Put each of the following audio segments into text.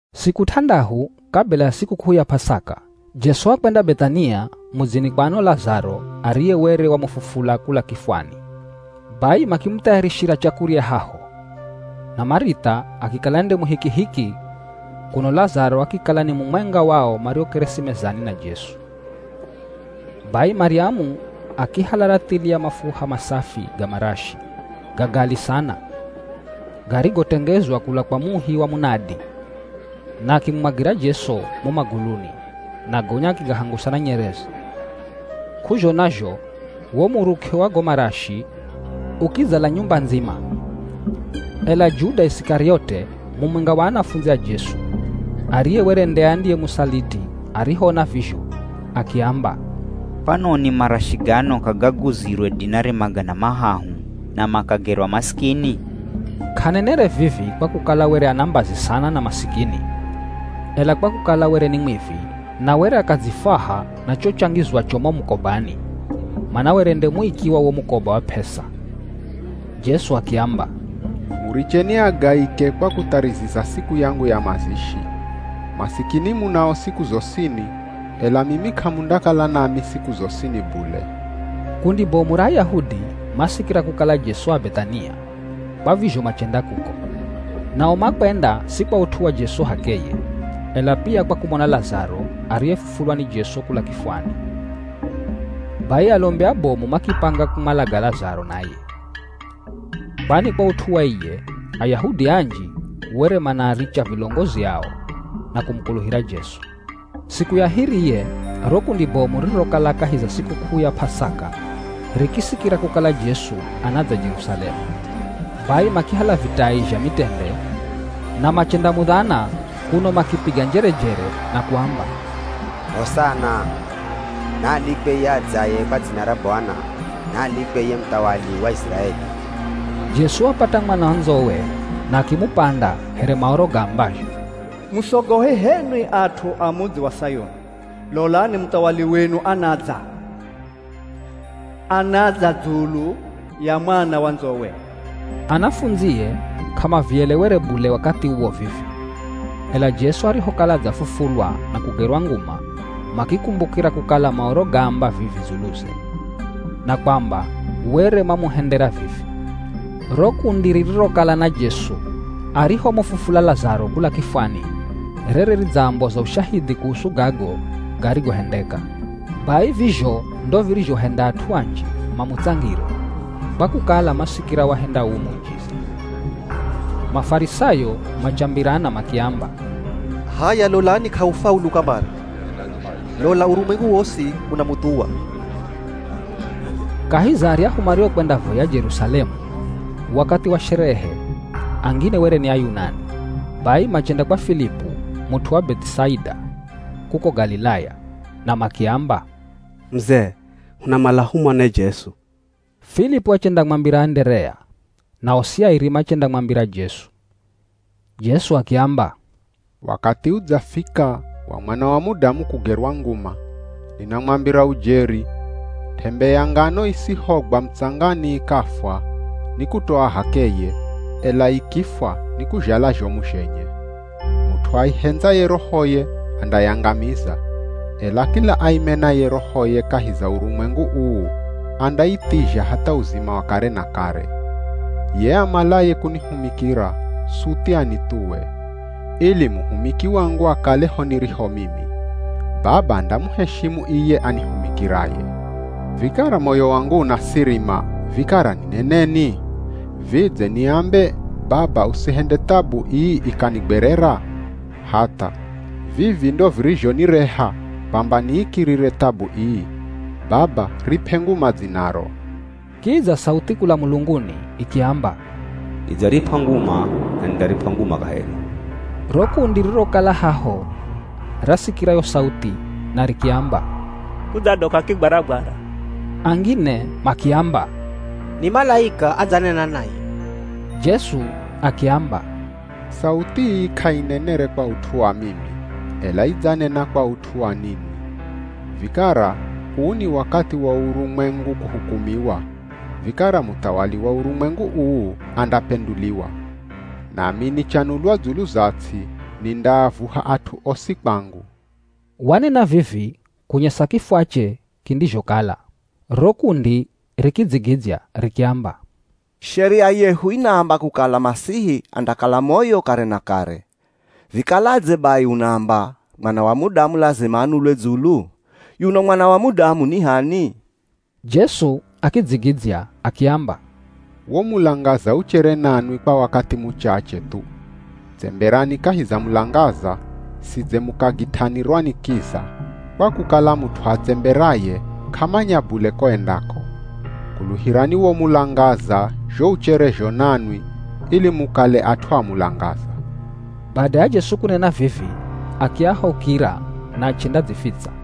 Siku t'andahu kabila ya sikuk'uu ya P'asaka, Jesu wakwenda Beth'ania mudzini kwa ano Lazaro ariye were wamufufula kula kifwani. Bai makimuthayarishira chakurya haho, na Marith'a akikala nde muhikihiki kuno Lazaro akikala ni mumwenga wao mariokeresi mezani na Jesu. Bai Maryamu akihala rathili ya mafuha masafi ga marashi ga gali sana garigotengezwa kula kwa muhi wa munadi na akimumwagira Jesu mo maguluni na gonya akigahangusa na nyereze. K'uzhona zho wo muruk'e wa go marashi ukidzala nyumba ndzima. Ela Juda Isikariote, mumwenga wa anafundzi a Jesu, ariye were nde andiyemusaliti arihoona vizho, akiamba, “Kwanoni marashi gano k'agaguzirwe dinari magana mahahu na makagerwa masikini?” K'anenere vivi kwa kukala were ana mbazi sana na masikini, ela kwa kukala were ni mwivi na were akadzifwaha na cho changizwacho mo mukobani, mana were nde muiki wa wo mukoba wa p'esa. Jesu akiamba, “Muricheni agaike kwa kuthariziza siku yangu ya mazishi. Masikini munao siku zosini, ela mimi k'amundakala nami siku zosini bule.” Kundi bomu ra Ayahudi masikira kukala Jesu a Beth'ania, kwa vizho machenda kuko. Nao makwenda si kwa ut'u wa Jesu h'akeye, ela pia kwa kumona Lazaro ariyefufulwa ni Jesu kula kifwani. Bai alombi abomu makipanga kumwalaga Lazaro naye. Kwani kwa ut'u wa iye, Ayahudi anji were manaaricha vilongozi ao na kumukuluhira Jesu. Siku ya hiriye ro kundi bomu ririrokala kahi za sikuk'uu ya P'asaka rikisikira kukala Jesu anadza Jerusalemu. Bai makihala vitai zha mitende na machendamudhana kuno makipiga njerejere na kuamba, “Hosana! Naalikwe iye adzaye kwa dzina ra Bwana! Naalikwe iye muthawali wa Iziraeli!” Jesu wapata mwana wa ndzowe na akimupanda here Maoro gaambazho, “Musogohe h'enwi at'u a mudzi wa Sayuni. Lolani muthawali wenu anadza! Anadza dzulu ya mwana wa ndzowe.” Anafundzie k'amavielewere bule wakathi uwo vivi, ela Jesu arihokala adzafufulwa na kugerwa nguma makikumbukira kukala Maoro gaamba vivi dzuluze, na kwamba were mamuhendera vivi. Ro kundi ririrokala na Jesu arihomufufula Lazaro kula kifwani rere ridzamboza ushahidhi kuhusu gago garigohendeka. Bai vizho ndo virizhohenda at'u anji mamutsangire, kwa kukala masikira wahenda uu muujiza. Mafarisayo machambirana makiamba, “H'aya lolani k'ahufaulu kamare. Lola urumwengu wosi unamuthuwa!” Kahi za aryahu mariokwendavoya Jerusalemu wakathi wa sherehe angine were ni Ayunani. Bai machenda kwa Filipu, mut'u wa Beth'isaida kuko Galilaya na makiamba, “Muzee, hunamala humone Jesu.” Filipu achendamwambira Anderea na osi airi machendamwambira Jesu. Jesu akiamba, “Wakathi udzafika wa Mwana wa Mudamu kugerwa nguma Ninamwambira ujeri, t'embe ya ngano isihogwa mutsangani ikafwa, ni kutoa h'akeye, ela ikifwa nikuzhala zhomu zhenye. Mut'u aihendzaye rohoye, andayangamiza, ela kila aimenaye rohoye kahi za urumwengu uu, andaithizha hatha uzima wa kare na kare. Ye amalaye kunihumikira, suthi anithuwe, ili muhumiki wangu akale ho niriho mimi. Baba andamuheshimu iye anihumikiraye.” “Vikara moyo wangu unasirima, vikara nineneni? Vidze niambe, ‘Baba, usihende thabu ii ikanigwerera?’ Hatha, vivi ndo virizhonireha kwamba niikirire thabu ii. Baba rip'e nguma dzinaro.” Kidza sauthi kula mulunguni ikiamba, “Nidzarip'a nguma na nindarip'a nguma kaheri.” Ro kundi ririrokala haho rasikira yo sauthi na rikiamba, “Kudzadoka kigwaragwara.” Angine makiamba, “Ni malaika adzanena naye.” Jesu akiamba, “Sauthi ii k'ainenere kwa ut'u wa mimi, ela idzanena kwa ut'u wa ninwi. Vikara uu ni wakathi wa urumwengu kuhukumiwa, vikara muthawali wa urumwengu uu andapenduliwa. Nami nichanulwa dzulu za ts'i, nindaavuha at'u osi kwangu.” Wanena vivi kunyesa kifwache kindizhokala. Ro kundi rikidzigidzya rikiamba, “Sheria yehu inaamba kukala Masihi andakala moyo kare na kare. Vikaladze bai unaamba, ‘Mwana wa Mudamu lazima anulwe dzulu?’ Yuno Mwana wa Mudamu ni h'ani?” Jesu akidzigidzya akiamba, “Wo mulangaza uchere nanwi kwa wakathi muchache thu. Tsemberani kahi za mulangaza, sidze mukagit'anirwa ni kiza, kwa kukala mut'u atsemberaye k'amanya bule ko endako. Kuluhirani wo mulangaza zho ucherezho nanwi ili mukale at'u a mulangaza.” Bada ya Jesu kunena vivi akiahaukira na achendadzifitsa.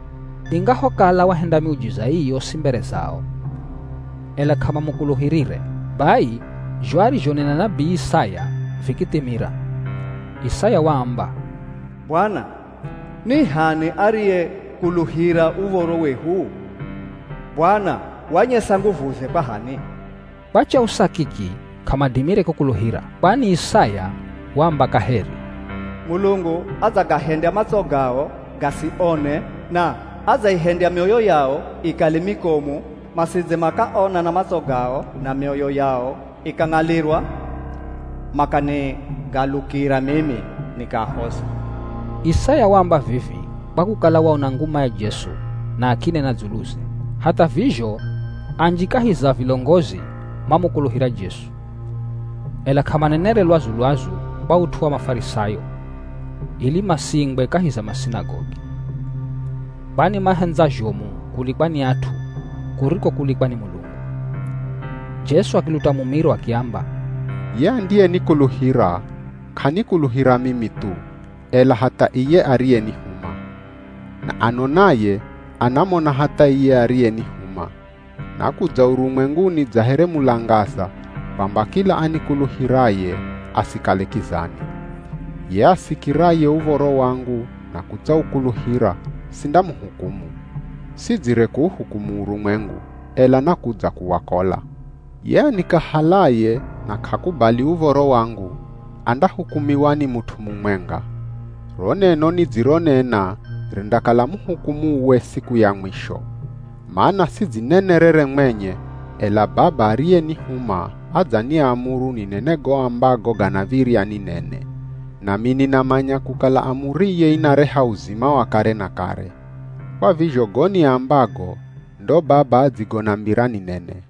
Ingahokala wahenda miujiza ii yosi mbere zao, ela k'amamukuluhirire. Bai zho arizhonena nabii Isaya vikithimira. Isaya waamba, “Bwana, ni h'ani ariyekuluhira uv̱oro wehu? Bwana wanyesa nguvuze kwa h'ani?” Kwa chausa kiki k'amadimire kukuluhira. Kwani Isaya waamba kaheri, “Mulungu adzagahendya matso gao gasione na adzaihendya mioyo yao ikale mikomu masidze makaona na matso gao na mioyo yao ikang'alirwa, makanigalukira mimi, nikaahoza.” Isaya waamba vivi kwa kukala waona nguma ya Jesu na akinena dzuluze. Hatha vizho anji kahi za vilongozi mamukuluhira Jesu, ela k'amanenere lwazu-lwazu kwa ut'u wa Mafarisayo, ili masiingwe kahi za masinagogi. Kwani mahendza zhomu kulikwa ni at'u kuriko kulikwa ni Mulungu. Jesu akiluta mumiro, akiamba, “Ye andiyenikuluhira, k'anikuluhira mimi thu, ela hatha iye ariyenihuma. Na anonaye, anamona hatha iye ariyenihuma. Nakudza urumwenguni dza here mulangaza kwamba kila anikuluhiraye asikale kizani. Ye asikiraye uv̱oro wangu na kutsaukuluhira sindamuhukumu. Sidzire kuuhukumu urumwengu, ela nakudza kuwakola. Ye anikahalaye na k'akubali uv̱oro wangu andahukumiwa ni mut'u mumwenga. Ro neno nidzironena rindakala muhukumuwe siku ya mwisho. Mana sidzinenerere mwenye, ela Baba ariyenihuma adzaniamuru ninene go ambago ganav̱irya ninene. Nami ninamanya kukala amuriye inareha uzima wa kare na kare. Kwa vizho go niambago ndo Baba adzigonambira ninene.”